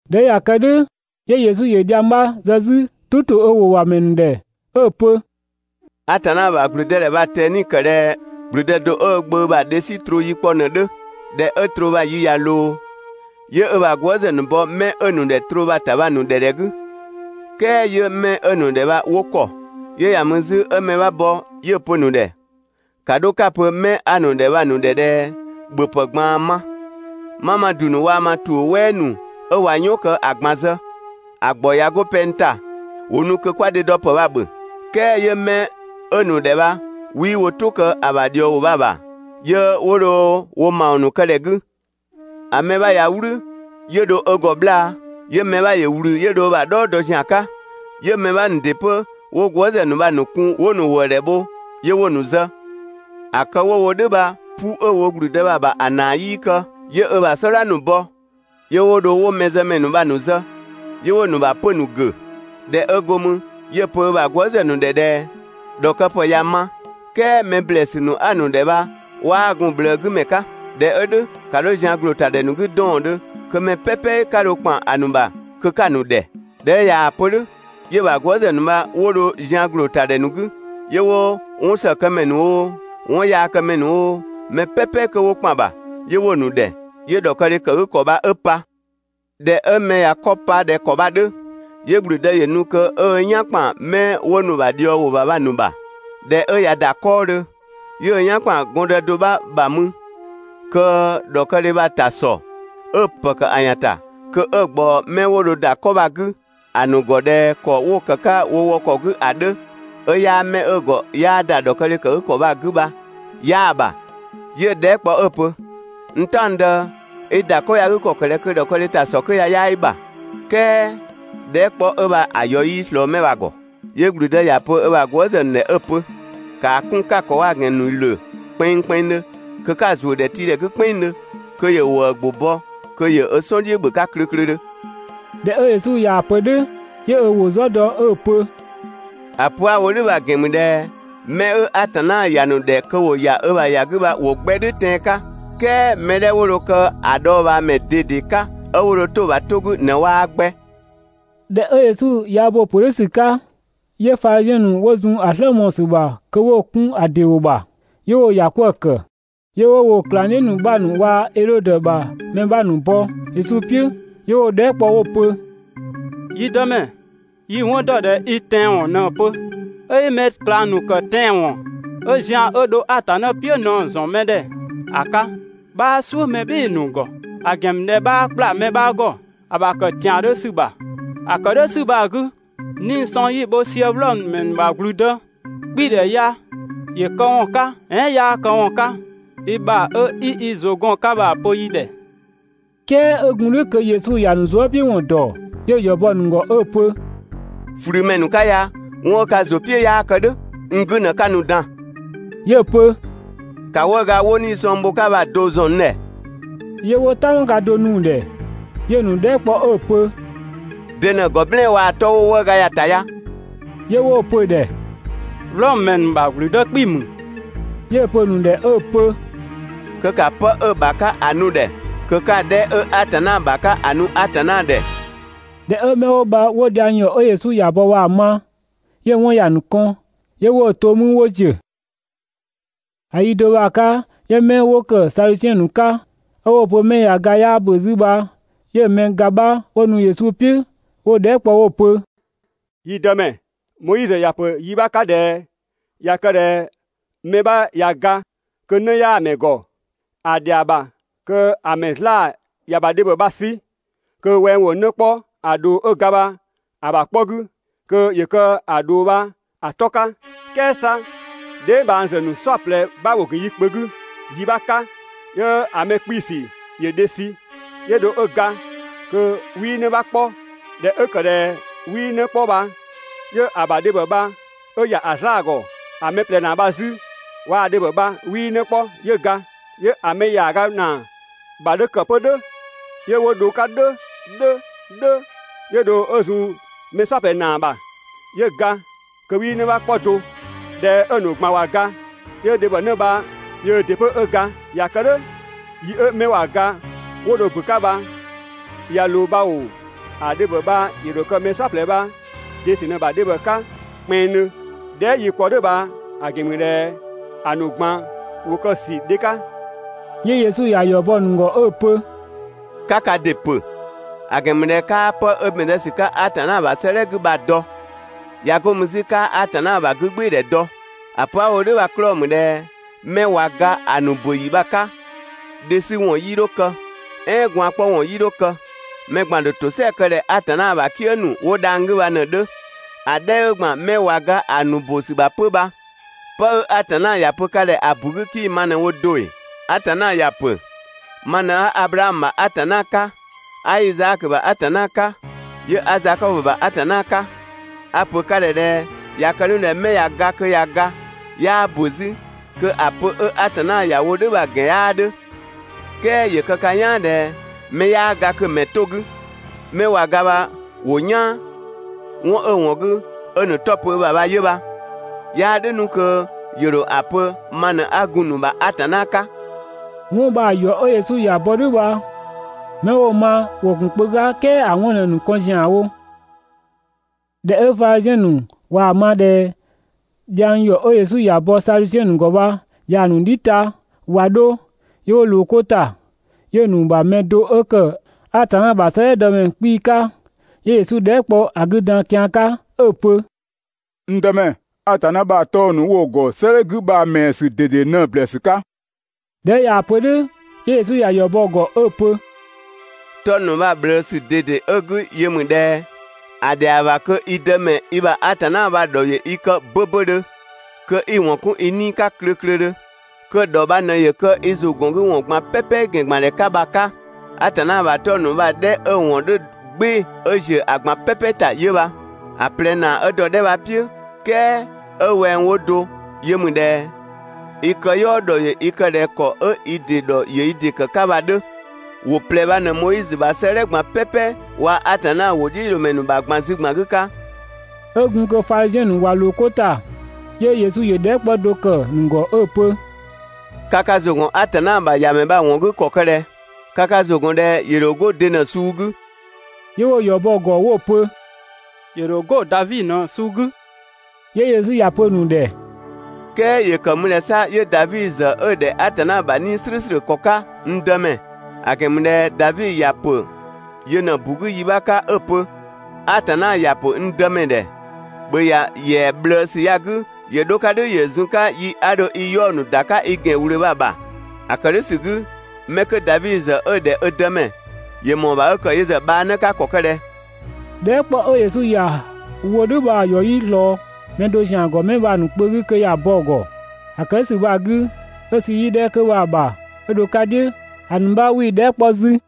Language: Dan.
꞊Dhɛ 'ö ꞊ya kë "dhʋ̈ 'yö Yesu ‑yö dhiang 'bha zë 'zü "tʋ ‑to ö ‑wʋ ‑bha ‑mɛ ‑nu ‑dhɛ 'ö‑ pö: «Atanna ‑bha ‑gblüdëdhɛ bha‑ ꞊tɛni ‑kë ꞊dhɛ ‑gblüdë do 'ö ö gbö ‑bha dhe 'sü ‑sü troo yi kpɔ ꞊në‑ 'dhö. ꞊Dhɛ 'ö troo bha‑ yi ꞊ya ꞊loo, 'yö ö ‑bha gwëëzë ‑nu bɔ 'mɛ 'ö‑ ‑nu ‑dhɛ troo bha‑ ‑ta bha‑ ‑nu ‑dhɛ ‑dhɛ 'gü, "kɛɛ 'yö 'mɛ 'ö‑ ‑nu ‑dhɛ bha 'wo ‑kɔ. 'Yö ‑ya mü 'zü 'ö mɛ 'bha bɔ 'yö‑ pö‑ ‑nu ‑dhɛ: «‑Ka 'dho 'ka‑ pö‑ 'mɛ 'a‑ ‑nu ‑dhɛ bha‑ ‑nu ‑dhɛ ꞊dhɛ ‑bhöpë ꞊gbaan ma, 'ma ma ‑du ‑nu waa‑ ma ‑tuʋ̈ "wɛɛ ‑nu 'ö ꞊wa "yɔn kë ‑a ꞊gban zë, ‑a ‑gbɔ ꞊ya 'go pɛng ‑ta, ‑wo nu kö 'kwa dhe dɔ ‑pë bha‑ ‑bhö.» "Kɛɛ 'yö 'mɛ 'ö‑ ‑nu ‑dhɛ bha 'wii wo "tʋ kë ‑a ‑bha ꞊dhiɔwʋ bha‑ ‑bha, 'yö 'wo dho wo ‑mawɔn ‑nu kë ‑dhɛ 'gü. ‑A mɛ 'bha ꞊ya "wlü 'yö dho ö ‑gɔ 'bhlaa‑, 'yö‑ mɛ 'bha ‑yö ꞊wlü 'yö dho ö ‑bha "dhɔɔ dɔ ‑zian 'ka. 'Yö‑ mɛ 'bha ‑nu ‑dɩ 'pö 'wo gwëëzë ‑nu bha‑ ‑nu kun 'wo‑ ‑nu ‑wëëdhɛ bho 'yö 'wo‑ ‑nu zë. ‑A kë 'wo‑ wo "dhʋ̈ bha, 'pu 'ö‑ wo ‑gblüdë bha‑ ‑bha ‑a ‑naa 'yii kë. 'Yö ö bha "sɔdha ‑nu bɔ 'yö 'wo dho 'wo mɛzëmɛ ‑nu bha‑ ‑nu zë, 'yö 'wo‑ ‑nu ‑bha 'pö‑ ‑nu ‑gʋ̈. ꞊Dhɛ 'ö go mü, 'yö‑ pö ö ‑bha gwëëzë ‑nu ‑dhɛ ꞊dhɛ: «‑Dhɔkëpë ya ꞊ya ma, "kɛɛ mɛ ‑blɛɛsü ‑nu 'a‑ ‑nu ‑dhɛ bha 'waa gun‑ ꞊bhlëë 'gü ‑mɛ 'ka. ꞊Dhɛ 'ö "dhʋ̈, ‑ka 'dho zian ‑gloo ‑ta ‑dhɛ ‑nu 'gü 'dɔɔndhö, kö mɛ "pɛpɛ 'ka dho ‑kpan ‑a ‑nu ‑bha kö 'ka‑ ‑nu ‑dhɛ!» ꞊Dhɛ 'ö ꞊yaa‑ pö "dhʋ̈, 'yö‑ ‑bha gwëëzë ‑nu bha 'wo dho zian ‑gloo ‑ta ‑dhɛ ‑nu 'gü 'yö 'wo 'wɔnsëkëmɛ ‑nu oo, 'wɔnyaakëmɛ ‑nu oo, mɛ "pɛpɛ kö 'wo ‑kpan ‑bha, 'yö 'wo‑ ‑nu ‑dhɛ, 'yö ‑dhɔkëdhe ‑kë 'gü ‑kɔ bha 'ö pa. ꞊Dhɛ 'ö mɛ ꞊ya 'kɔ pa ꞊dhɛ ‑kɔ bha‑ 'dhö, 'yö ‑gblüdë ‑yö nu kö 'ö ö "yan ‑kpan 'mɛ 'wo nu ö ‑bha ꞊dhiɔwʋ ‑bha bha‑ ‑nu ‑bha. ꞊Dhɛ 'ö ꞊ya ‑da 'kɔɔdhö, 'yö ö "yan ‑kpan gɔndë do 'bha ‑bha mü kö ‑dhɔkëdhe bha‑ ‑ta ‑sɔ ('ö‑ ‑pë ‑kë ‑a ‑yan ‑ta kö 'ö‑ ꞊gbaɔ 'mɛ 'wo dho ‑da 'kɔ bha‑ 'gü ‑a ‑nu ‑gɔ ꞊dhɛ ‑kɔ 'wo‑ ‑kë 'ka wo wɔ ‑kɔ 'gü ‑a 'dhö 'ö 'yaa 'mɛ 'ö‑ ‑gɔ 'yaa ‑da ‑dhɔkëdhɛ ‑kë 'gü ‑kɔ 'gü bha) 'yaa‑ ‑bha, 'yö‑ dhɛɛ" kpɔ 'ö‑ pö: «N "taɔngdë, i ‑da 'kɔ ya‑ 'gü ‑kɔ ‑kë ꞊dhɛ kö ‑dhɔkëdhe ‑ta ‑sɔ 'kö ya 'yaa i ‑bha? "Kɛɛ dhɛɛ" kpɔ 'ö bha‑ ‑yɔ 'yii‑ ꞊slɔɔ 'mɛ bha‑ ‑gɔ. 'Yö ‑gblüdë ‑ya pö ö ‑bha gwëëzë ‑nu ‑dhɛ 'ö‑ pö: «‑Kaa 'kun 'ka‑ ‑kɔ waa‑ ‑gɛn ‑nu ‑lö kpɛnngkpɛnngdhö kö 'ka‑ ‑zuö ‑dhɛtiidhɛ 'gü "kpɛnngdhö kö ‑yö ‑wëë ‑gbʋ bɔ kö ‑yö ö "sɔn "dhiʋ̈ ‑bhö 'ka klöklödhö. ꞊Dhɛ 'ö Yesu ꞊yaa‑ pö "dhʋ̈, 'yö ö ‑wʋ "zɔ dɔ 'ö‑ pö: «‑A pö 'a‑ wo "dhʋ̈ bha‑ ‑gɛn ‑mü ꞊dhɛ mɛ 'ö Atanna ‑ya ‑nu ‑dhɛ kö ‑wo ‑ya ö ‑bha ‑ya 'gü bha ‑wo 'gbɛ "dhʋ̈ tɛan‑ 'ka, "kɛɛ mɛ 'dhɛ 'wo dho kë ‑a dhɔɔbhaamɛ ꞊dede 'ka 'ö 'wo dho 'to‑ ‑bha 'to 'gü ꞊në 'waa 'gbɛ. ꞊Dhɛ 'ö Yesu ꞊ya bo‑ ‑pö "dhʋ̈ ‑sü 'ka, 'yö Fadhiziɛn ‑nu 'wo zun ‑a "slë mɔɔ‑ ‑sü ‑bha kö 'wo‑ 'kun ‑a ‑dɩ ‑wʋ ‑bha, 'yö 'wo‑ ‑ya 'kwëë‑ ‑kë. 'Yö 'wo woo‑ ꞊klangdhiʋ̈ ‑nu 'bha ‑nu waa‑ Edhodö ‑bha mɛ 'bha ‑nu bɔ Yesu "piʋ̈, 'yö 'wo‑ dhɛɛ" kpɔ 'wo‑ pö: «Yi Dëmɛ, yi‑ 'wɔn ‑dɔ ꞊dhɛ i tɛanwɔn ꞊në‑ pö, 'ö 'i mɛ ꞊klang ‑nu ‑kë tɛanwɔn 'ö zian 'ö dho Atanna "piʋ̈ ꞊në‑ ‑zɔn mɛ ‑dhɛ ‑a 'ka, 'bhaa "suʋ̈ mɛ "bhɩɩ‑ ‑nu ‑gɔ, ‑a ‑gɛn ‑mü ꞊dhɛ 'bhaa ‑kpla mɛ 'bha ‑gɔ ‑a ‑bha kë ‑tiandhö ‑sü ‑bha. ‑A ‑kë "dhʋ̈ ‑sü bha‑ 'gü, 'nii‑ sɔng 'yi‑ bho sië Wlɔmö ‑mɛ ‑nu ‑bha ‑gblüdë 'kpii‑ ‑dhɛ ya ‑yö këwɔn 'ka, "ɛɛn 'yaa këwɔn 'ka? i ‑bha 'ö 'i i ‑zʋ gɔn‑ 'ka ‑a pö yi ‑dhɛ!» "Kɛɛ 'ö gun "dhʋ̈ kö Yesu ‑ya ‑nu zuëpiʋ̈wɔn ‑dɔ, 'yö‑ ‑yɔ bɔ‑ ‑nu ‑gɔ 'ö‑ pö: «꞊Flümɛ ‑nu 'ka ya, 'wɔn 'ö ka ‑zʋ "piʋ̈ 'yaa kë "dhʋ̈, n 'gü ꞊në 'ka nu‑ dan.» 'Yö‑ pö: «‑Ka 'wëëga 'wo 'nii‑ sɔng bho‑ 'ka bha‑ do ‑zɔn n ‑dhɛ!» 'Yö 'wo "tanmaga do nu‑ ‑dhɛ. 'Yö‑ ‑nu dhɛɛ" kpɔ 'ö‑ pö: «De ꞊në‑ ‑gɔ "blɛɛn‑ waa‑ ‑a 'tɔ 'wo 'wëëga ya‑ ‑ta ya?» 'Yö 'wo‑ pö‑ ‑dhɛ: «Wlɔmö ‑mɛ ‑nu ‑bha ‑gblüdë 'kpii‑ ‑mü.» 'Yö‑ pö‑ ‑nu ‑dhɛ 'ö‑ pö: «Kö ‑ka 'pë 'ö‑ ‑bha 'ka ‑a nu‑ ‑dhɛ kö 'ka‑ 'dhɛ 'ö Atanna ‑bha 'ka ‑a nu Atanna ‑dhɛ!» ꞊Dhɛ 'ö 'mɛ 'wo bha 'wo dhiang ‑yɔ 'ö Yesu ‑ya bɔ bha‑ ma, 'yö‑ 'wɔn ‑ya ‑nu kɔn 'yö 'wo‑ to 'mü 'wo ‑ziö. ‑A yi do bha‑ 'ka 'yö 'mɛ 'wo ‑kë 'pö Sadusiɛn ‑nu 'ka 'ö 'wo‑ pö 'mɛ ꞊ya ga 'yaa ‑bö 'zü bha 'yö‑ mɛ ga 'bha 'wo nu Yesu "piʋ̈ 'wo‑ dhɛɛ" kpɔ 'wo‑ pö: «Yi Dëmɛ, Moizö ‑ya ‑pö yi 'bha 'ka ꞊dhɛ ꞊ya kë ꞊dhɛ mɛ 'bha ꞊ya ga kö 'në 'yaa‑ ‑mɛ ‑gɔ, ‑a ‑dhɛa ‑bha kö‑ ‑mɛ 'zlaa‑ ‑ya ‑mɛ ‑bha dhebhɔ bha‑ 'sü kö wɛng ‑wo 'në 'kpɔ ‑a ꞊dhoo 'ö ga bha‑ ‑bha 'kpɔ 'gü kö ‑yö kë‑ ꞊dhoo bha‑ 'tɔ 'ka. "Kɛɛ 'sa dheebhangzë ‑nu "saɔplɛ 'bha ‑wo ‑gun yi kpö 'gü yi 'bha 'ka, 'yö‑ mɛ 'kpiisü ‑yö dhe sü 'yö dho 'ö ga kö 'wii 'në 'bha 'kpɔ. ꞊Dhɛ 'ö ‑kë ꞊dhɛ 'wii 'në 'kpɔ bha 'yö‑ ‑bha dhebhɔ bha 'ö ‑ya ‑a 'zlaa‑ ‑gɔ. ‑A mɛ ꞊plɛ ‑naa bha 'zü waa‑ dhebhɔ bha 'wii 'në 'kpɔ 'yö ga, 'yö‑ mɛ ‑yaaga ‑naa ‑bha 'dhö ‑kë 'pö "dhʋ̈ 'yö 'wo dho‑ 'ka "dhʋ̈ "dhʋ̈ "dhʋ̈, 'yö dho 'ö zun‑ mɛ "saɔplɛ ‑naa ‑bha, 'yö ga kö 'wii 'në 'kpɔ do. ꞊Dhɛ 'ö‑ ‑nu ꞊gban ꞊wa ga, 'yö dhebhɔnë bha yöö ‑dɩ 'pö 'ö ga. ꞊Ya kë "dhʋ̈, yi 'ö 'mɛ ꞊wa ga 'wo dho ‑bö 'ka bha ꞊ya ꞊loo bha ‑oo, ‑a dhebhɔ bha‑ ‑dho kë mɛ "saɔplɛ bha‑ de ‑sü ꞊në‑ ‑bha dhebhɔ 'ka kpɛnngdhö? Dhɛɛ" 'yi‑ kpɔ "dhʋ̈ bha‑ ‑gɛn ‑mü ꞊dhɛ ‑a ‑nu ꞊gban ‑wo kë‑ ‑sü dhe 'ka!» 'Yö Yesu ‑ya ‑yɔ bɔ‑ ‑nu ‑gɔ 'ö‑ pö: «'Ka ka ‑dɩ ‑pö, ‑a ‑gɛn ‑mü ꞊dhɛ 'kaa 'pë 'ö ‑bɛn zë ‑sü 'ka Atanna ‑bha 'sëëdhɛ 'gü bha‑ dɔ. ꞊Ya 'go mü 'zü 'kaa Atanna ‑bha 'gügbɩɩdhɛ dɔ. ‑A pö 'a‑ wo "dhʋ̈ bha‑ 'klɔɔ‑ ‑mü ꞊dhɛ 'mɛ ꞊wa ga ‑a ‑nu ‑bö ‑yi bha‑ 'ka, dhe 'sü ‑wɔn 'yii 'dho kë, "ɛɛn gwaan‑ 'kpɔ ‑wɔn 'yii 'dho kë, mɛ ꞊gban‑ ‑dho ‑tosɛa kë ꞊dhɛ Atanna ‑bha "kië ‑nu 'wo dhang‑ 'gü bha ꞊në‑ 'dhö. ‑A 'dhɛ 'ö ‑gban 'mɛ ꞊wa ga ‑a ‑nu ‑bö ‑sü ‑bha 'pö bha, 'pë 'ö Atanna ‑ya pö ka ‑dhɛ ‑a ‑bu 'gü 'kii‑ ma ꞊në wo do ‑ee? Atanna ‑ya ‑pö: ‹Ma ꞊në 'a Ablaamö ‑bha Atanna 'ka, 'a Izaakö ‑bha Atanna 'ka, 'yö 'a Zakɔbö ‑bha Atanna 'ka.› A‑ ‑pö ka ‑dhɛ ꞊dhɛ ꞊ya kë 'nu ꞊dhɛ 'mɛ ꞊ya ga kö ꞊ya ga 'yaa ‑bö 'zü, kö ‑a pö 'ö Atanna ‑ya wo "dhʋ̈ bha‑ ‑gɛn 'yaa 'dhö, "kɛɛ ‑yö kë ka "yaan ꞊dhɛ mɛ 'yaa ga kö mɛ‑ 'to‑ 'gü, 'mɛ ꞊wa ga bha ‑wo "yaan, 'wɔn 'ö‑ ‑wɔn 'gü 'ö‑ ‑nu 'tɔ pö ö ‑bha bha 'yö bha, ('yaa "dhʋ̈ 'nu kö ‑yö ‑dho ‑a pö ma ꞊në 'a gun‑ ‑nu ‑bha Atanna 'ka). 'Wɔn bha‑ ‑yɔ 'ö Yesu ‑ya bɔ "dhʋ̈ bha, 'mɛ 'wo‑ ma ‑wo ‑gun kpö 'ka, "kɛɛ ‑a 'wɔn ꞊në‑ ‑nu kɔn ‑zianwo. ꞊Dhɛ 'ö Fadhiziɛn ‑nu waa‑ ma ꞊dhɛ dhiang ‑yɔ 'ö Yesu ‑ya bɔ Sadusiɛn ‑nu ‑gɔ bha yaa‑ ‑nu "dhi ta ꞊wa 'dho, 'yö 'wo ꞊loo 'ko ‑ta. 'Yö‑ ‑nu ‑bha mɛ do 'ö kë Atanna ‑bha 'sëëdhɛ dɔ mɛ 'kpii‑ 'ka, 'yö Yesu dhɛɛ" kpɔ ‑a 'gü dan kian 'ka 'ö‑ pö: «N Dëmɛ, Atanna ‑bha 'tɔng‑ ‑nu 'wo‑ ‑gɔ 'sëëdhɛ 'gü bha‑ ‑mɛɛ ‑sü ꞊dede ꞊në‑ ꞊bhlëësü 'ka?» ꞊Dhɛ 'ö ꞊yaa‑ pö "dhʋ̈ 'yö Yesu ‑ya ‑yɔ bɔ‑ ‑gɔ 'ö‑ pö: «'Tɔng‑ ‑nu bha‑ ꞊bhlëësü ꞊dede 'ö‑ 'gü yö ‑mü ꞊dhɛ: ‑A ‑dhɛa ‑bha kö i Dëmɛ i ‑bha Atanna bha a‑ ‑dhɔ ‑yö i kë 'böbödhö, kö 'i‑ ‑wɔn 'kun i 'nii‑ 'ka klöklödhö, kö‑ ‑dhɔ bha ꞊në ‑yö kë i ‑zʋgɔngüwɔn ꞊gban "pɛpɛ ‑gɛn ‑gban ‑dhɛ 'ka bha‑ 'ka. Atanna ‑bha 'tɔng‑ ‑nu bha‑ 'dhɛ 'ö‑ ‑wɔn 'dhö "gbɩɩ‑ 'ö ‑ziö ‑a ꞊gban "pɛpɛ ‑ta 'yö bha. ‑A ꞊plɛ ‑naa 'ö dɔ‑ 'dhɛ bha‑ "piʋ̈, "kɛɛ 'ö wɛng 'wo do yö ‑mü ꞊dhɛ: I këyɔɔ ‑dhɔ ‑yö i kë ꞊dhɛ ‑kɔ 'ö i ‑dɩ ‑dhɔ ‑yö i ‑dɩ kë‑ 'ka bha‑ 'dhö. ‑Wʋ ꞊plɛ bha ꞊në Moizö ‑bha 'sëëdhɛ ꞊gban "pɛpɛ waa‑ Atanna ‑wʋdhiʋ̈loomɛ ‑nu ‑bha ꞊gban zü ‑gban 'gü 'ka. 'Ö gun kö Fadhiziɛn ‑nu ꞊wa ꞊loo 'ko ‑ta, 'yö Yesu ‑yö dhɛɛ" 'kpɔ do ‑kë ‑nu ‑gɔ 'ö‑ pö: «Ka ka ‑zʋ ‑gɔn Atanna bha ‑Yamɛ bha‑ ‑wɔn 'gü ‑kɔ kë ꞊dhɛ? Ka ka ‑zʋ ‑gɔn ꞊dhɛ ‑yö ‑dho 'go de ꞊në‑ suu 'gü?» 'Yö 'wo‑ ‑yɔ bɔ‑ ‑gɔ 'wo‑ pö: «‑Yö ‑dho 'go Davi ꞊në‑ suu 'gü.» 'Yö Yesu ‑ya pö‑ ‑nu ‑dhɛ: "Kɛɛ ‑yö ‑kë ‑mü ꞊dhɛ 'sa 'yö Davi ‑zë 'ö‑ ‑dhɛ Atanna ‑bha 'Nii‑ "slʋ̈ʋ̈slʋ̈ ‑kɔ 'ka, n Dëmɛ? ‑A ‑gɛn ‑mü ꞊dhɛ Davi ‑ya ‑pö yö ꞊në‑ ‑bu 'gü yi 'bha 'ka 'ö‑ pö: ‹Atanna ‑ya ‑pö n Dëmɛ ‑dhɛ: ‑Bhö ‑ya ‑yɛa ꞊bhlëësü ya‑ 'gü ‑yö 'dho‑ 'ka "dhʋ̈ ‑yö zun‑ 'ka yi 'a dho i 'yaɔ‑ ‑nu ‑da 'ka i ‑gɛn ꞊wlöö bha‑ ‑bha!› ‑A ‑kë "dhʋ̈ ‑sü 'gü 'mɛ 'kö Davi ‑zë 'ö‑ ‑dhɛ ö Dëmɛ, ‑yö ‑mɔɔ ‑bha 'ö ‑kë yö ‑zë bhaanë 'ka ‑kɔ ‑kë ꞊dhɛ? Dhɛɛ" 'kpɔ 'ö Yesu ‑ya wo "dhʋ̈ bha‑ ‑yɔ 'yii ꞊slɔɔ mɛ do ‑zian ‑gɔ 'mɛ bha‑ ‑nu kpö 'gü kö ‑ya bɔ‑ ‑gɔ. ‑A ‑kë "dhʋ̈ ‑sü bha‑ 'gü, 'ö sü yi 'dhɛ 'kö bha‑ ‑bha 'ö dho‑ 'ka "dhiʋ̈, ‑a ‑nu 'bha 'wii‑ dhɛɛ" 'kpɔ 'zü.